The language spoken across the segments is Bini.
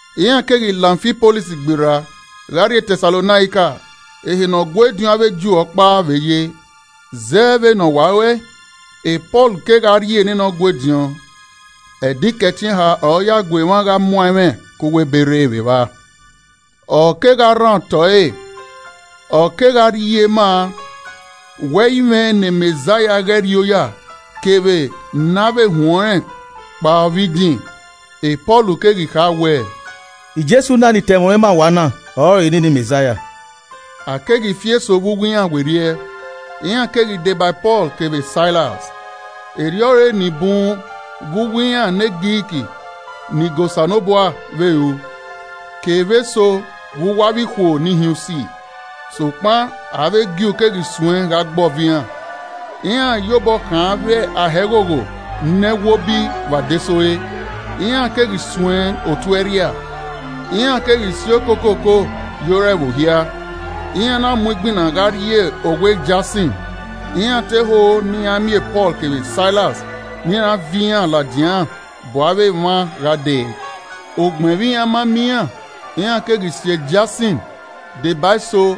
Iran keghi la Amfipolis gberra gha rrie Tẹsalonaika ehe ne Ọgua ediọn avbe Ju ọkpa vbe ye. Zẹ vbene ọ wa ru ẹe, Pọl kegha rrie nene Ọgua ediọn. Ẹdẹ Ikẹtin eha ọre ọ ya gu emwa gha muan ẹmwẹ ke uwu Ebe rre vbe evba. Ọ kegha rhan otọ ẹre, ọ kegha rhie ma wẹẹ ẹ i mwẹ ne Mẹzaia ghẹ rri oya kevbe ne a vbe huẹn ọnrẹn kapo vbe idin. Pọl keghi kha wẹẹ, “Jesu na ne I ta ẹmwẹ ọnrẹn ma uwa na, ọrọre nene Mẹzaia.” A keghi fi eso vbe uwu iran werriẹ, iran keghi deba Pọl kevbe Sailas, erriọ ọre ni bun vbe uwu iran ne Grik ni ga Osanobua vbe ru, kevbe eso vbe uwu avbe ikhuo nihiunsi. Sokpan avbe Ju keghi suẹn gha gbe ọvo iran. Iran ye obọ khan avbe ahẹghogho ne ẹwobi vbe adesẹ ore, iran keghi suẹn otu ẹrhia. Iran keghi si okokoko ye ore ẹvbo hia, iran na mu igbinna gha rrie owa Jasin, iran te ho ne iran miẹn Pọl kevbe Sailas ne iran viọ iran ladian bu avbe emwa gha dee. Ugbẹn vbe iran ma miẹn iran, iran keghi si Jasin deba eso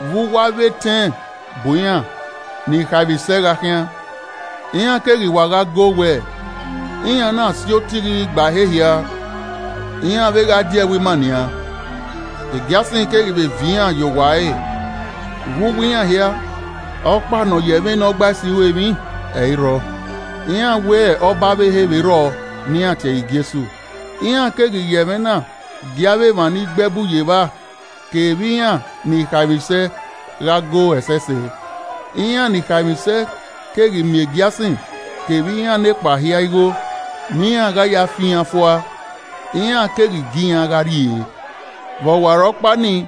vbe uwu avbe etẹn bu iran ni khaemwisẹ gha khian, iran keghi wa gha goo wẹẹ, “Iran na si otighi gba ehe hia, iran vbe gha die ẹvbo ima nian, Jasin keghi vbe viọ iran ye owa ẹre, vbe uwu iran hia, ọkpa ne ọ ya ẹmwẹ Nọgbaisi ru emwi ẹ i rrọọ, iran wẹ ọba ọvbehe vbe rrọọ, ne iran tie ẹre Jesu.” Iran keghi ya ẹmwẹ na gie avbe emwa ni gbe ẹbu ye evba kevbe iran ni khaemwisẹ gha go ẹsẹse. Iran ni khaemwisẹ keghi miẹn Jasin kevbe iran nekpa hia igho ne iran gha ya fan iran fua, iran keghi gie iran gha rrie. Vbe ọwarọkpa nii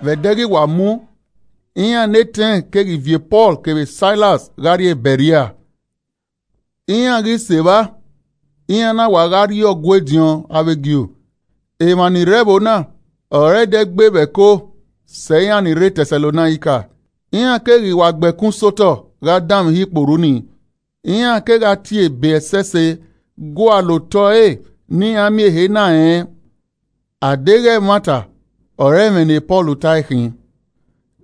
vbe ẹdẹ ghi wa mu, iran ne etẹn keghi viọ Pọl kevbe Sailas gha rrie Bẹrea. Iran ghi sẹ evba, iran na wa gha rrie Ọgua ediọn avbe Ju. Emwa ni rre ẹvbo na ọre ẹdẹ gbe vbe ẹko sẹ iran ni rre Tẹsalonaika. Iran keghi wa gbe ẹkun sẹ otọ gha danmwehọ ikporhu nii, iran kegha tie Ebe ẹsẹse gualọ otọ ẹre ne iran miẹn ehe na rẹn a deghẹ ẹmwata ọre ẹmwẹ ne Pọl tae khin.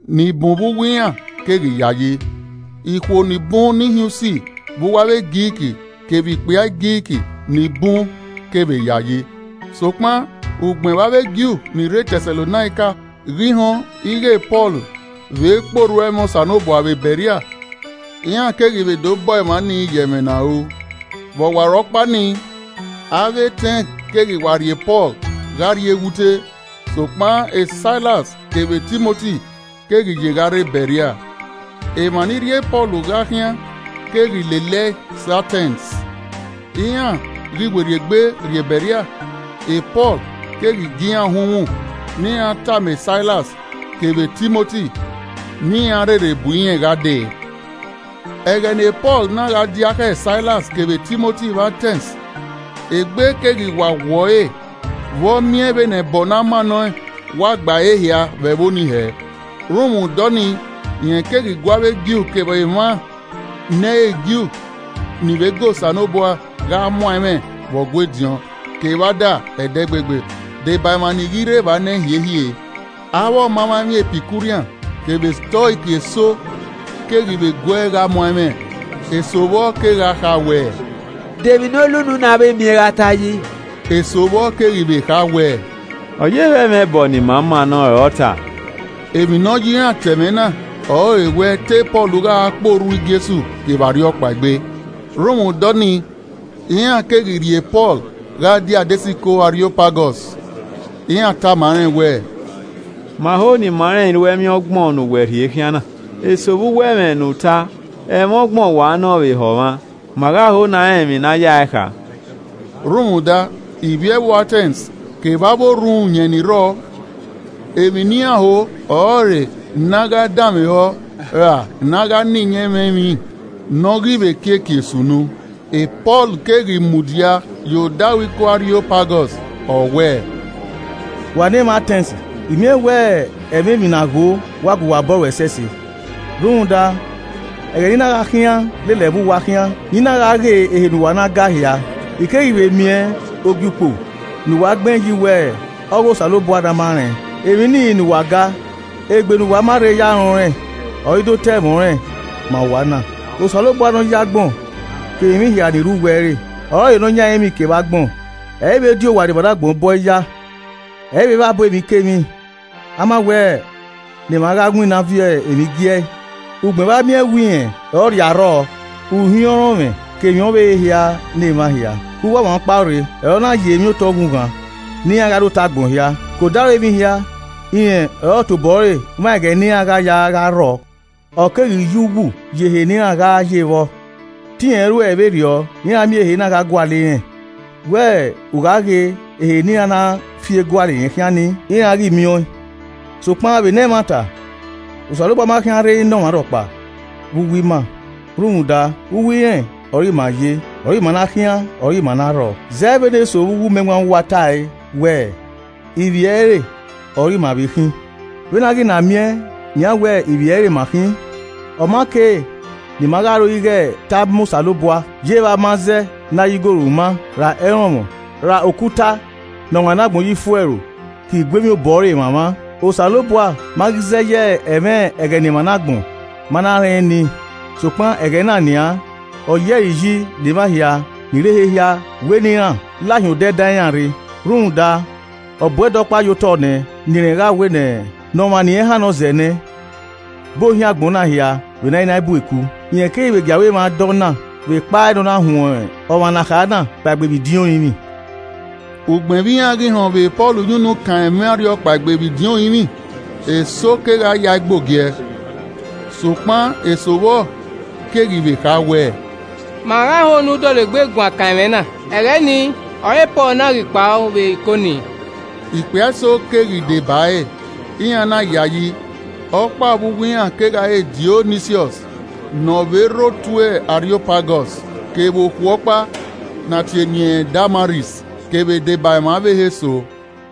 Ni bun vbe uwu iran keghi yayi. Ikhuo ni bun ni hin usi vbe uwu avbe Grik, kevbe ikpia Grik ni bun kevbe yayi. Sokpan ugbẹn vbe avbe Ju ni rre Tẹsalonaika ghi họn ighẹ Pọl vbe kpe orhu ẹmwẹ Osanobua vbe Bẹrea, iran keghi vbe do bọọ emwa nii ye ẹmwẹ ne a ru. Vbe ọwarọkpa nii, avbe etẹn keghi wa rhie Pọl gha rrie eghute, sokpan Sailas kevbe Timoti keghi ye gha rre Bẹrea. Emwa ni rhie Pọl gha khian keghi lele ẹe sẹ Atẹns. Iran ghi werriegbe rrie Bẹrea, Pọl keghi gie iran uhunmwu ne iran tama Sailas kevbe Timoti ne iran rherhe bu irẹn gha dee. Ẹghẹ ne Pọl na gha diakhẹ Sailas kevbe Timoti vbe Atẹns, egbe keghi wa wọ ẹre vbe ọ miẹn vbene ẹbọ ne a mannọẹn wa gba ehe hia vbe ẹvbo nii hẹ. Rhunmwuda ọnii rẹn keghi gu avbe Ju kevbe emwa ne ẹ i re Ju ni vbe ga Osanobua gha muan ẹmwẹ vbe Ọgua ediọn kevbe ada ẹdẹgbegbe, deba emwa ni ghi rrie evba nẹ hiehie. Avbe ọmamwaemwi Epikurian kevbe Stoik eso keghi vbe guee gha muan ẹmwẹ. Eso vbọ kegha kha wẹ, “De emwi ne ole unu na vbe miẹn gha ta yi?” Eso vbọ keghi vbe kha wẹ, “Ọ ye vbe ẹmwẹ ẹbọ ne ima mannọẹn ọre ọ ta.” Emwi ne ọ ye iran ta ẹmwẹ na ọrọre wẹ te Pọl gha kpe orhu Jesu kevbe arhiọkpaegbe. Rhunmwuda ọnii, iran keghi rhie Pọl gha die adesẹ iko Ariopagọs, iran tama rẹn wẹẹ, “Ma ho ne ima rẹn iruẹmwi ọgbọn ne uwẹ rhie khian na. Eso vbe uwu ẹmwẹ ne u ta, ẹmwẹ ọgbọn wa nọ vbe ehọ mwa, ma gha ho ne a rẹn emwi ne a ya ẹe kha.” (Rhunmwuda ivbi ẹvbo Atẹns kevbe avbe orhunmwuyẹn ni rrọọ, emwi ne iran ho ọrọre ne a gha danmwehọ ra ne a gha na iyẹn ẹmwẹ emwi ne ọ ghi vbe kiekie sunu.) Pọl keghi mudia ye odaro iko Ariopagọs, ọ wẹẹ, “Wa ne emwa Atẹns, I miẹn wẹ ẹmwẹ emwi na gho wa gua uwa obọ ro ẹsẹse. Rhunmwuda, ẹghẹ ne I na gha khian lele ẹvbo uwa khian, ne I na gha ghe ehe ne uwa na ga hia, I keghi vbe miẹn Ogiukpo ne uwa gbẹn yi wẹẹ, ‘Ọ ghe Osanobua Ne a Ma rẹn!’ Emwi nii ne uwa ga, egbe ne uwa ma rhe ya rẹn ọnrẹn, ọre I do ta ẹmwẹ ọnrẹn ma uwa na. Osanobua ne ọ yi agbọn kevbe emwi hia ni rre uwu ẹre, ọrọre Nọyan ẹrinmwi kevbe agbọn, ẹ i vbe di owa ne emwa ne agbọn bọe ya. Ẹ i vbe vbabọ emwikemwi, a ma wẹ ne emwa gha winna viọ emwi gi ẹe ugbẹn vbe a miẹn wẹ rẹn ọre ọ rhie arrọọ, uhiọnrọnmwẹ ke emwi ọvbehe hia ne emwa hia. Ke uwu ọmwa ọkpa rre, ọre ọ na yi emwi otọ ughughan ne iran gha rre otọ agbọn hia. ke odaro emwi hia, rẹn ọre ọ tobọ ẹre mwa ẹghẹ ne iran gha ya gha rrọ, ọ keghi ye uwu yi ehe ne iran gha ye vbọ. Te irẹn ruẹe vberriọ ne iran miẹn ehe na gha gualọ irẹn, wẹ ughaghe ehe ne iran na fie gualọe khian ni, iran ghi miẹn ọẹn. Sokpan vbene ẹmwata, Osanobua ma khian rrei ne ọmwa rhọkpa vbe uwu ima. Rhunmwuda, “ ‘Uwu irẹn ọre ima ye, ọre ima na khian ọre ima na rrọọ.’ Zẹ vbene eso vbe uwu umẹwaẹn uwa ta ẹe wẹẹ, ‘Ivbi ẹre ọre ima vbe khin.’ Vbene a ghi na miẹn nian wẹ ivbi ẹre ma khin, ọ ma kei ne ima gha ro ighẹ te ama Osanobua yevbe amazẹ ne a ya igoru ma, ra ẹrọnmwọ ra okuta ne ọmwa ne agbọn ye ifuẹro ke iguemwi obọ ẹre mwamwa. Osanobua ma ghi zẹ ye ẹmwẹ ẹghẹ ne emwa ne agbọn ma na rẹn nii, sokpan ẹghẹ na nian, ọ yi ẹre iyi ne emwa hia ni rre ehe hia wẹ ne iran lahin odẹ dan iran rre. Rhunmwuda ọ bu ẹdẹ ọkpa ye otọ nẹ ne irẹn gha wẹ ne ọmwa ne irẹn hannọ zẹ nẹ, bu ohiẹn agbọn na hia vbe ne a i na bu eku. rẹn keghi vbe gie aro emwa da ọ na vbe ekpa ne ọna huẹn ọmwa ne a kha na kpaegbe vbe idin orinmwi!” Ugbẹn vbe iran ghi họn vbe Pọl ya unu kan ẹmwẹ arhiọkpaegbe vbe idin orinmwi, eso kegha yae gbe ogiẹ, sokpan eso vbọ keghi vbe kha wẹ, “Ma gha ho ne u dọlegbe guan kan ẹmwẹ na. Ẹghẹ nii ọre Pọl na ghi kpao vbe iko nii.” Ikpia eso keghi deba ẹre, iran na yayi, ọkpa vbe uwu iran kegha re Diọnisiọs ne ọ vbe rre otu Ariopagọs, kevbe okhuo ọkpa ne a tie eni ẹnrẹn Damaris, kevbe deba emwa ọvbehe eso.